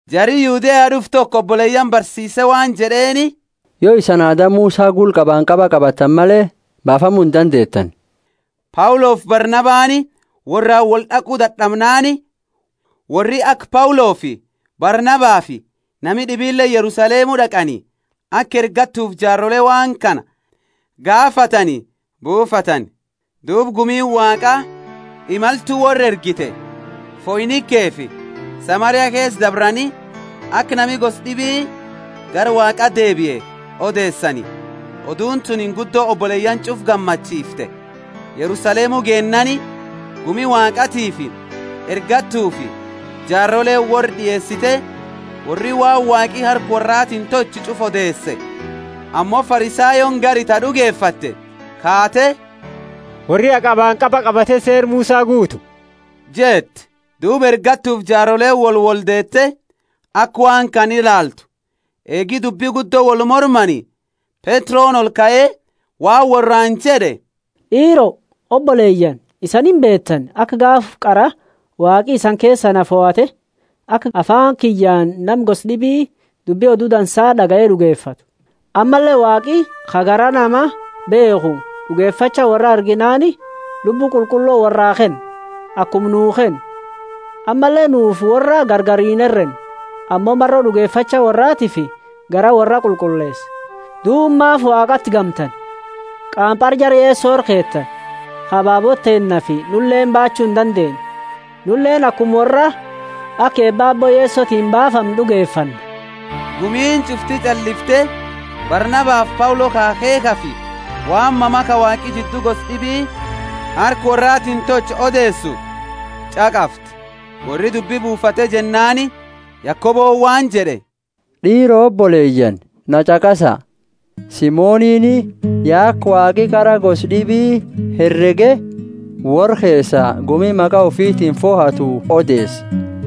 Jari Yudea toko d'ufe oboleyaani barsiise waan jed'eeni, Yo isani aada Musa gula qabanqaba qabattani male, baafamu indandeetani. Paulofi Barnabani worraani wold'aqu dad'amnaani, worri aka Paulofi Barnabafi nami d'ibileeni Yerusalemu d'aqani, aka ergattufi jaarole waan kana gaafatani buufatani. Duuba gummiini Waaqaa imaltu worra ergite; Foinikefi Samaria keesa dabrani, aka nami gosa d'ibi gara Waaqa deebie odeesani. Oduuni tuni guddo oboleyaani ch'ufa gammachiifte. Yerusalemu geennaani, gumi Waaqatiifi ergattufi jaaroleeni worra d'ieesite, worri waan Waaqi harka worratiini tolche ch'ufa odeese. Ammo Farisayooni gari ta d'ugefatte, kaate, Worri ha qabanqaba qabate Seera Musa guutu jette. Duuba ergattufi jaaroleeni wolwoldeete aka waan kana ilaaltu. Eegi dubbi guddo wolmormani, Petroni olkae waan worraani jed'e, D'iiro, oboleyaani isani imbeetani, aka gaafa qara Waaqi isani keesaa na fohate, aka afaani kiyyaani nami gosa d'ibi dubbi Odu Dansa d'agaye d'ugefatu. Ammalle Waaqi ka garaa nama beekhu d'ugefacha worra arginaani Lubbu Qulqullo worraa kenne, akuma nuu kenne. Ammalle nufi worra gargari inherenne, ammo maro d'ugefacha worraatiifi garaa worra qulqulleese. Duuba maafi Waaqati gamtani, qaampara jara Yeso ira keetani, ka ababoota teennaafi nuleeni baachu indandeenne? Nuleeni akuma worraa aka eeba Aabbo Yesotiini baafamnu d'ugefanna. Gumiini ch'ufti ch'allifte Barnabafi Paulo ka akheekhafi waan mama ka Waaqi jiddu gosa d'ibii harka worraatiini tolche odeesu ch'aqafte. Worri dubbi buufate jennaani Yakoboni waan jed'e, D'iiro oboleyaani na ch'aqasa! Simonini ya aka Waaqi qara gosa d'ibi herege worra keesaa gumi maqa ufitiini fohatu odeese.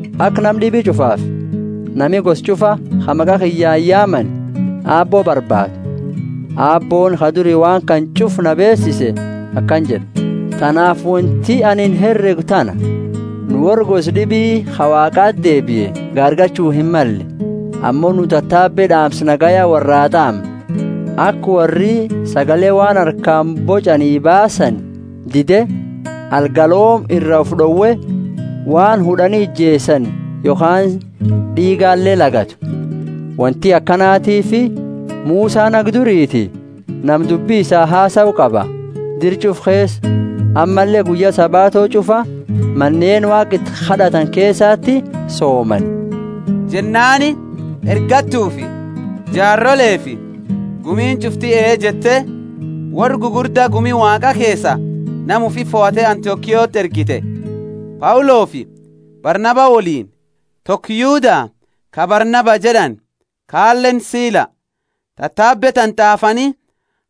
Aka nama d'ibi ch'ufaafi nami gosa ch'ufa, ka maqa kiyyaani yaamani, Aabbo barbaadu. Aabbooni, ka duri waan kana ch'ufa nama beesise akana jed'a. Tanaafi wonti anini heregu tana: Nu worra gosa d'ibi ka Waaqati deebie gaargalchu himmalle. Ammo nu tatabe d'aamsa nagaya worraa t'aamna, aka worri sagale waan harkaani boch'ani baasani dide, algalooma ira ufi d'owe, waan hud'ani ijeesani yokhaani d'iigale lagatu. Wonti akanatiifi Musani haga duriiti nama dubbi isaa hasau qaba, dira ch'ufa keesa; ammalle guyya Sabato ch'ufa maneeni Waaqa iti kad'atani keesati soomani. Jennaani ergattufi jaarolefi gumiini ch'ufti ee jette, worra gugurda gumi Waaqaa keesaa nama ufi fohate Antiokiati ergite, Paulofi Barnaba woliini: toko Yuda ka Barnaba jed'ani kaaleni Sila. Tatabe tana t'aafani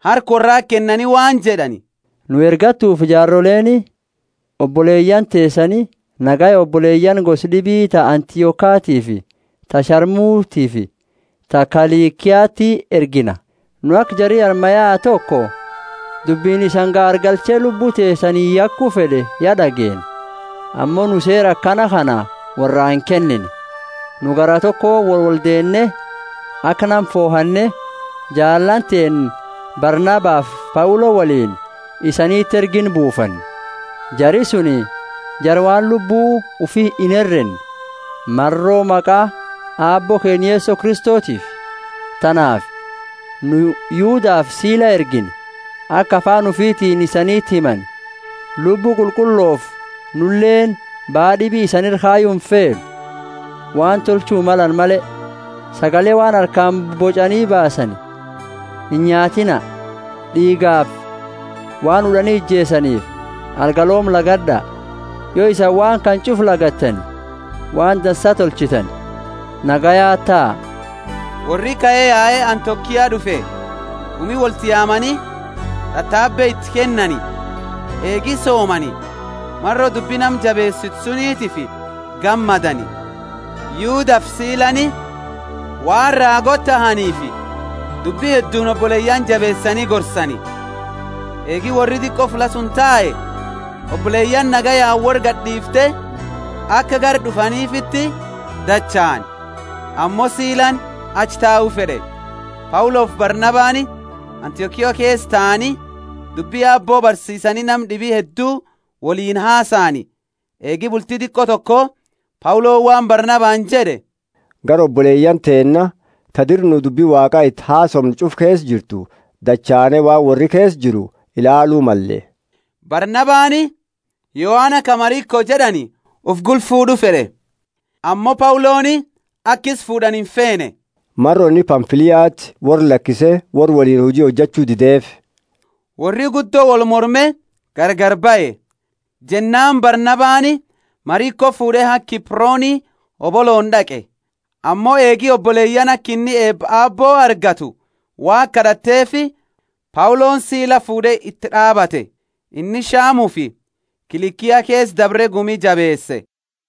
harka worrati kennani waan jed'ani: Nu ergattufi jaaroleeni, oboleyaani teesani, nagaya oboleyaani gosa d'ibi ta Antiokiatiifi ta Shamutiifi ta Kilikiati ergina. Nu aka jari armaa yae toko dubbini isani gaargalche lubbu teesani yaku fed'e ya d'ageenne; ammo nu seera akana kana worraa inkennine. Nu garaa tokooni wolwoldeenne, aka nama fohanne jaalaani teenna Barnabafi Paulo woliini isaniti erginu buufanne. Jari suni jara waan lubbu ufi inherenne, maro maqa Aabbo keenna Yeso Kristotiifi. Tanaafi nu Yudafi Sila ergine, aka afaani ufitiini isaniti himani. Lubbu Qulqullofi nuleeni baa d'ibi isani ira kayu imfeenu, waan tolchu malani male: sagale waan harkaani boch'ani baasani inyaatiina; d'iigafi waan hud'ani ijeesaniifi algalooma lagad'a. Yo isani waan kana ch'ufa lagattani waan dansa tolchitani. Nagayaati taa. Worri kae yae Antiokia d'ufe, gumi wolti yaamani tatabe iti kennani. Eegi soomani, maro dubbi nama jabeesitu sunitiifi gammadani. Yudafi Silani, waan raagoota tahaniifi, dubbi hedduuni oboleyaani jabeesani gorsani. Eegi worri diqo fulla suni tae, oboleyaani nagayaani worra gadi d'iifte, aka gara d'ufanifiti dachaani. [ Ammo Silani achi tau fed'e.] Paulofi Barnabani Antiokia keesa taani, dubbi Aabbo barsiisani nama d'ibi heddu woliini hasaani. Eegi bulti diqo toko Pauloni waan Barnabani jed'e, Gara oboleyaani teenna, ta dira nu dubbi Waaqa iti hasoomne ch'ufu keesa jirtu, dachaane waan worri keesa jira ilaalu male. Barnabani Yohana, ka Mariko jed'ani, ufi gula fuud'u fed'e. Ammo Pauloni aka isa fuud'ani imfeene, maro inni Pamfiliati worra lakise worra woliini huji tolchu dideefi. Worri guddo wolmorme gargari bahe. Jennaani Barnabani Mariko fuud'e haga Kiproni hobolooni d'aqe. Ammo eegi oboleyaani aka inni eeba Aabbo argatu Waaqa kad'ateefi Pauloni sila fuud'e iti d'aabate. Inni Shamufi Kilikia keesa dabre gumi jabeese.